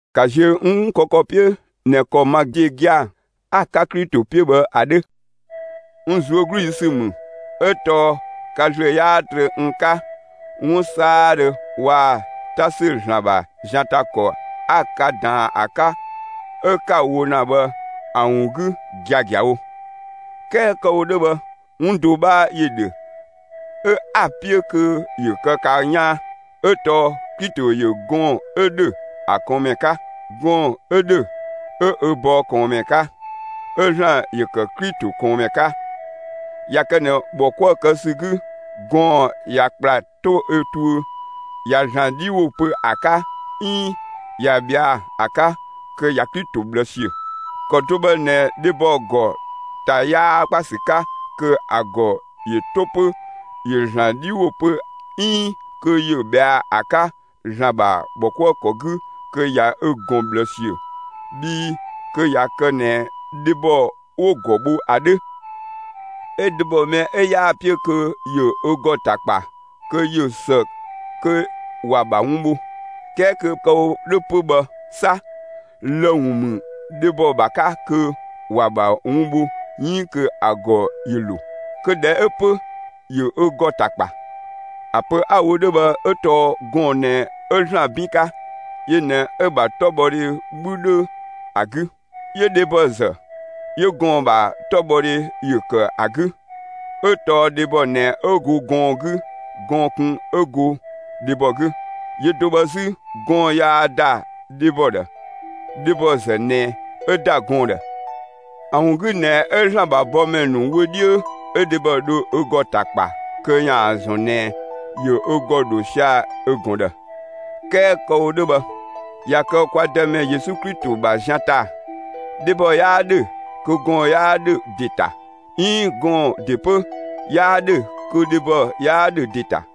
‑Ka ziö n 'wun kë ‑kɔ 'piö ꞊nɛ ‑kɔ ma ‑de gia‑ 'a‑ 'ka Klito 'piö bhë ‑a 'dhö. N ꞊zuögludhi ‑sü ‑mü 'ö tɔɔ ka ‑zlö 'yaa trö n 'ka 'wun 'saadhö waa‑ 'ta ‑sü ‑Zlan ‑bha zian ‑ta ‑kɔ 'a ka ꞊daan ‑a 'ka 'ö 'ka‑ wo ‑na bhë ‑a ‑wun 'gü giagiawo. 'Kɛɛ kë‑ wo 'dhö bhë 'wun do 'bhaa ‑yö ‑dhö 'ö 'a‑ 'piö kö ‑yö kë ka 'yaan; 'ö tɔɔ: Klito ‑yö gɔɔn‑ 'ö ‑dhö ‑a ꞊kɔɔnmɛ 'ka; gɔɔn‑ 'ö ‑dhö, 'ö ö bɔɔ ꞊kɔɔnmɛ 'ka; 'ö ‑Zlan ‑yö ‑kë Klito ꞊kɔɔnmɛ 'ka. ꞊Ya kë ꞊nɛ ‑bhɔ 'kuë‑ kë ‑sü 'gü, gɔɔn‑ ꞊ya ‑kpla 'to ö tuö ꞊ya ‑Zlan 'dhi ‑wo pö ‑a 'ka 'iin ꞊ya ꞊bhɛa' ‑a 'ka, kö ꞊ya Klito ꞊bhlë ‑siö. ‑Kɔ do bhë ꞊nɛ dhebɔ ‑gɔ ‑ta 'yaa ‑kpa ‑sü 'ka, kö ‑a ‑gɔ ‑yö 'to 'pö ‑yö ‑Zlan 'dhi ‑wo pö 'iin kö yö ꞊bhɛa'‑ ‑a 'ka ‑Zlan ‑bha ‑bhɔkuëkɔ 'gü, kö ꞊ya ö ꞊gɔn ꞊bhlë ‑siö. Bhii kö ꞊ya kë ꞊nɛ dhebɔ 'wo‑ ‑gɔ bho ‑a 'dhö. 'Ö dhebɔ mɛ 'ö 'yaa‑ 'piö kö ‑yö ö ‑gɔ ‑ta ‑kpa, kö ꞊yö ‑së kö ‑wa ‑bha wun bho. 'Kɛɛ kö kë‑ wo 'dhö 'pö bhë 'sa, lë‑ ‑wun ‑mü dhebɔ ‑bha 'ka kö ‑wa ‑bha wun bho 'iin kö ‑a ‑gɔ ‑yö ‑lo. Kö ꞊dhɛ 'ö 'pö, ‑yö ö ‑gɔ ‑ta ‑kpa. ‑A pö 'a‑ wo 'dhö bhë 'ö tɔɔ gɔɔn‑ ꞊nɛ 'ö ‑Zlan 'bin 'ka; yö ꞊nɛ 'ö‑ ‑bha 'tɔbhɔdhe 'bhü 'dhö ‑a 'gü. 'Yö dhebɔ ‑zë, 'yö gɔɔn‑ ‑bha 'tɔbhɔdhe ‑yö ‑kë ‑a 'gü. 'Ö tɔɔ dhebɔ ꞊nɛ 'ö go gɔɔn‑ 'gü; gɔɔn‑ kun 'ö go dhebɔ 'gü. Yö do bhë 'zü, gɔɔn‑ yaa ‑da dhebɔ ‑dhë; dhebɔ ‑zë ꞊nɛ 'ö ‑da gɔɔn‑ ‑dhë. ‑A ‑wun 'gü ꞊nɛ 'ö ‑Zlan ‑bha bɔmɛ ‑nu wö 'dhiö, 'ö dhebɔ dho ö ‑gɔ ‑ta kpa kö ‑yaan ‑zɔn ꞊nɛ ‑yö ö ‑gɔ ‑dho sia‑ ö ꞊gɔn ‑dhë. 'Kɛɛ kë‑ wo 'dhö bhë, ꞊ya kë kwa Dëmɛ Yesu Klito ‑bha zian ‑ta dhebɔ 'yaa 'dhö kö gɔɔn‑ 'yaa 'dhö ‑de ‑ta 'iin gɔɔn‑ ‑de 'pö 'yaa 'dhö kö dhebɔ 'yaa 'dhö ‑de ‑ta.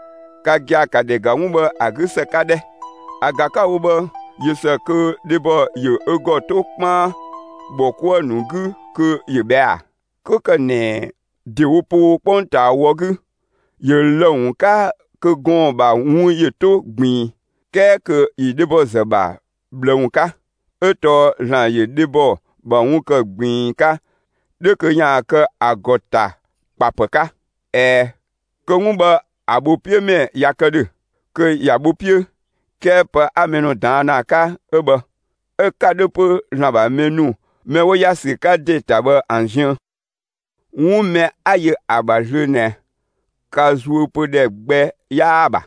Ka gia‑, ka ‑dhɛ ‑ga 'wun bhë ‑a 'gü ‑së 'ka 'dhɛ! ‑A ‑ga 'ka‑ wo bhë, ꞊yö ‑së kö dhebɔ ‑yö ö ‑gɔ 'to 'kpaan ‑bhɔ 'kuë‑ ‑nu 'gü kö ‑yö ꞊bhɛa'‑ ‑a? 'Kö ‑kë ꞊nɛ ‑dewo poo 'kpongtaa wɔ 'gü, ‑yö lë‑ ‑wun 'ka kö gɔɔn‑ ‑bha wun ‑yö 'to ꞊gbiin, 'kɛɛ kö ‑yö dhebɔ ‑zë ‑bha ꞊bhlë ‑wun 'ka; 'ö tɔɔ ‑Zlan ‑yö dhebɔ ‑bha wun ‑kë ꞊gbiin 'ka 'dhö kö ‑yaan kë ‑a ‑gɔ ‑ta kpa ‑pë 'ka. ꞊Ɛɛ, kö 'wun bhë ‑a ‑bho 'piö ‑mɛ ꞊ya kë ‑dhö, kö ‑ya bho 'piö; 'kɛɛ pë 'a mɛ ‑nu ꞊daan' ‑na ‑a 'ka 'ö bhë; 'ö‑ 'ka 'dhö 'pö ‑Zlan ‑bha mɛ ‑nu mɛ 'wo ‑ya ‑sü 'ka ‑de ‑ta bhë ‑an ziën. 'Wun mɛ 'a yö ‑a ‑bha zlöö ꞊nɛ, ka zuö pö ‑dhɛ gbɛ 'yaa‑ ‑bha,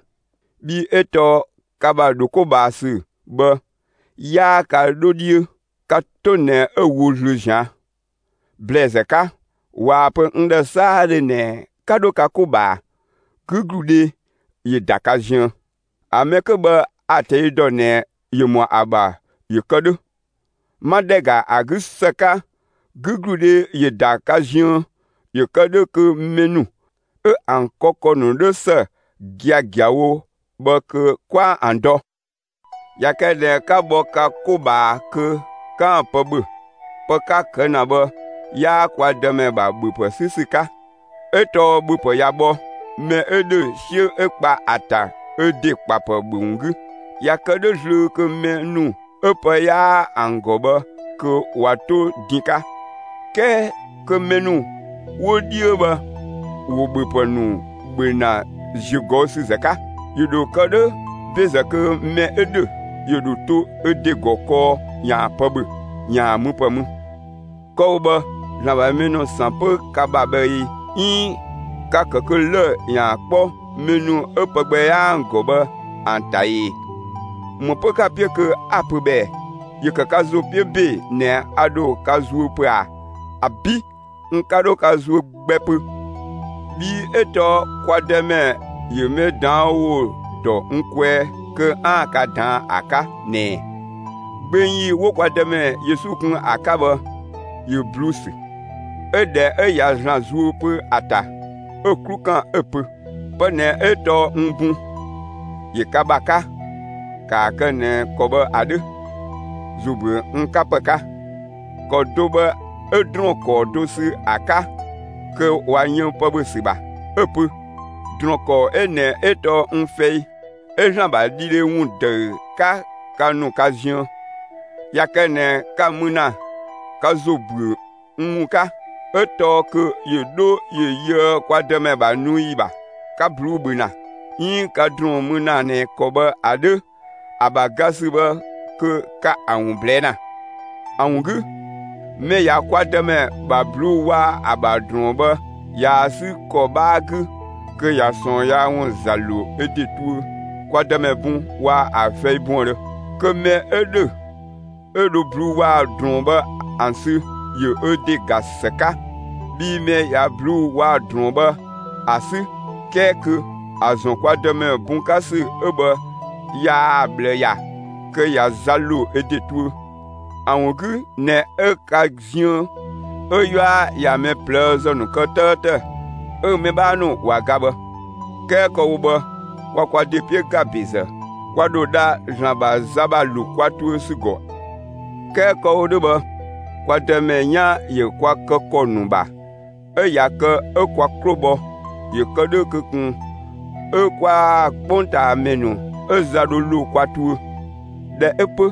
bhii 'ö tɔɔ ka ‑bha ‑dho 'ko ꞊bhaa ‑sü bhë, 'yaa ka 'dho 'dhiö; ka 'to ꞊nɛ 'ö‑ wo zlöö ꞊zian'. ‑Blɛɛzë 'ka, ꞊waa‑ pö n ‑dhë 'saadhö ꞊nɛ 'ka 'dho ka 'ko ꞊bhaa, 'gügludhe ‑yö ‑da ka ziën. ‑A mɛ 'kö bhë a‑ ꞊tɛi' ‑dɔ ꞊nɛ ‑yö ‑mɔ ‑a ‑bha ‑yö kë 'dhö. 'Ma ‑dhɛ ‑ga ‑a 'gü ‑së 'ka, 'gügludhe ‑yö ‑da ka ziën ‑yö kë 'dhö kö mɛ ‑nu 'ö ‑an kë ‑kɔ ‑nu 'dhö ‑së giagiawo bhë kö 'kwaan‑ ‑an dɔ. ꞊Ya kë ꞊nɛ 'ka bhɔ ka 'ko ꞊bhaa kö 'kaan‑ pë ‑bhö, pë 'ka‑ kë ‑na bhë, 'yaa kwa Dëmɛ ‑bha ‑bhöpë 'sü ‑sü 'ka; 'Ö tɔɔ ‑bhöpë ꞊ya bhɔ, mɛ 'ö ‑dhö 'siö 'ö kpa ‑a ‑ta ö ‑de ‑kpapë ‑bhö ‑wun 'gü. ꞊Ya kë 'dhö zlöö kö mɛ ‑nu 'ö pë 'yaa ‑an ‑gɔ bhë kö ꞊wa 'to din 'ka, 'kɛɛ kö mɛ ‑nu 'wo 'dhiö bhë ‑wo ‑bhöpë ‑nu ‑bhö ‑na ‑ziögɔüsüzë 'ka. ‑Yö ‑dho kë 'dhö ‑bezë kö mɛ 'ö ‑dhö ‑yö ‑dho to ö ‑de ‑gɔ kɔɔ ‑yaan pë ‑bhö, ‑yaan müpë mü. Kë‑ wo bhë ‑Zlan ‑bha mɛ ‑nu ‑san 'pö ka ‑bha bhë ꞊ee 'iin ka‑ kë kö lë‑ ‑yaan 'kpɔ mɛ ‑nu 'ö pë gbɛ 'yaa ‑an ‑gɔ bhë ‑an ‑ta ‑ee? ‑Më 'pö 'ka‑ 'piö kö 'a‑ pö bhë ꞊ɛ? ‑Yö ‑kë ka ‑zo 'piö ‑be ꞊nɛ a ‑dho ka zuö pö ꞊a! ‑Abi', n 'ka 'dho ka zuö gbɛ pö. Bhii 'ö tɔɔ kwa Dëmɛ ‑yö mɛ ꞊daan' ‑wo dɔ n kwɛɛ kö 'aan‑ ka ꞊daan'‑ ‑a 'ka ꞊nɛɛ: Gbeng ‑yi 'wo kwa Dëmɛ Yesu kun ‑a 'ka bhë, ‑yö ꞊bluu'‑ ‑sü; 'ö ꞊dhɛ 'ö ꞊ya ‑Zlan zuö pö ‑a ‑ta, 'ö‑ 'klu ‑kan 'ö‑ pö: «Pë ꞊nɛ 'ö tɔɔ n bun; ‑yö ka ‑bha 'ka. ‑Kaa kë ꞊nɛ ‑kɔ bhë ‑a 'dhö, ‑zo ‑büö n 'ka ‑pë 'ka.» ‑Kɔ do bhë 'ö ‑drɔɔn ‑kɔɔ do ‑sü ‑a 'ka kö ꞊wa yën pë ‑bhö ‑sü ‑bha, 'ö‑ pö: «‑Drɔɔn ‑kɔɔ 'ö ꞊nɛ 'ö tɔɔ n fɛi 'ö ‑Zlan ‑bha dhidhe ‑wun ‑dëü 'ka ka ‑nu ka ziën. ꞊Ya kë ꞊nɛ ka‑ mü ‑na, ka ‑zo ‑büö n ‑wun 'ka!» 'Ö tɔɔ kö ‑yö 'dho ‑yö yöë kwa Dëmɛ ‑bha nu ‑yi ‑bha, ka ꞊bluu'‑ ‑bhö ‑na, 'iin ka ‑drɔɔn mü ‑na ꞊nɛ ‑kɔ bhë ‑a 'dhö, ‑a ‑bha ga ‑sü bhë, kö ka ‑a ‑wun ꞊blɛɛ' ‑na. ‑A ‑wun 'gü, mɛ ꞊ya kwa Dëmɛ ‑bha ꞊bluu'‑ waa‑ ‑a ‑bha ‑drɔɔn bhë ꞊yaa‑ 'sü ‑kɔ 'bhaa 'gü, kö ꞊ya ꞊sɔɔn yaa ‑wun ‑za ‑lo ö ‑de tuö kwa Dëmɛ bun waa‑ ‑a fɛi buëndhö. Kö mɛ 'ö ‑dhö 'ö dho ꞊bluu'‑ waa‑ ‑drɔɔn bhë ‑an sü, ‑yö ö ‑de ‑ga ‑së 'ka! Bhii mɛ ꞊ya ꞊bluu'‑ waa‑ ‑drɔɔn bhë ‑a 'sü 'kɛɛ kö ‑a ‑zɔn kwa Dëmɛ bun 'ka ‑sü 'ö bhë yaa‑ ꞊bhlë ‑ya, kö ꞊ya za ‑lo ö ‑de tuö. ‑A ‑wun 'gü ꞊nɛ 'ö ka ziën 'ö 'yua ꞊ya mɛ ꞊plëëzë ‑nu kë 'tëëtë, 'ö mɛ 'bhaa ‑nu ꞊wa ga bhë. 'Kɛɛ kë‑ wo bhë, kwa kwa ‑de 'piö ‑ga ‑bezë, kwa ‑dho dha ‑Zlan ‑bha za ‑bha ‑lo kwa tuö ‑sü ‑gɔ. 'Kɛɛ kë‑ wo 'dhö bhë kwa Dëmɛ 'yan ‑yö kwa kë ‑kɔ ‑nu ‑bha 'ö ꞊ya kë 'ö kwa 'klo bhɔ ‑yö kë 'dhö kö ꞊kun 'ö kwaa‑ 'kpongtaamɛ ‑nu 'ö za dho ‑lo kwa tuö. ꞊Dhɛ 'ö 'pö,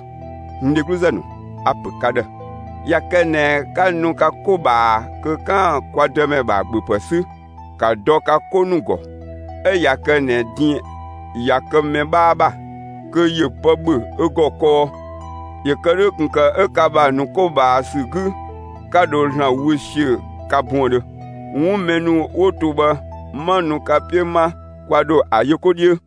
n dhegluzë ‑nu, a‑ ‑pö ka ‑dhë: ꞊Ya kë ꞊nɛ 'ka nu ka 'ko ꞊bhaa kö 'kaan‑ kwa Dëmɛ ‑bha ‑bhöpë 'sü, ‑ka dɔ ka 'ko ‑nu ‑gɔ. 'Ö ꞊ya kë ꞊nɛ din ꞊ya kë mɛ 'bhaa ‑bha, kö ‑yö pë ‑bhö ö ‑gɔ kɔɔ; ‑yö kë 'dhö ꞊kun ‑kë 'ö ka ‑bha ‑nu 'ko ꞊bhaa ‑sü 'gü, 'ka dho ‑Zlan wö ‑siö ka buëndhö. 'Wun mɛ ‑nu 'wo to bhë, 'ma nu ka 'piö 'ma, kwa ‑dho ‑a yö 'ko 'dhiö.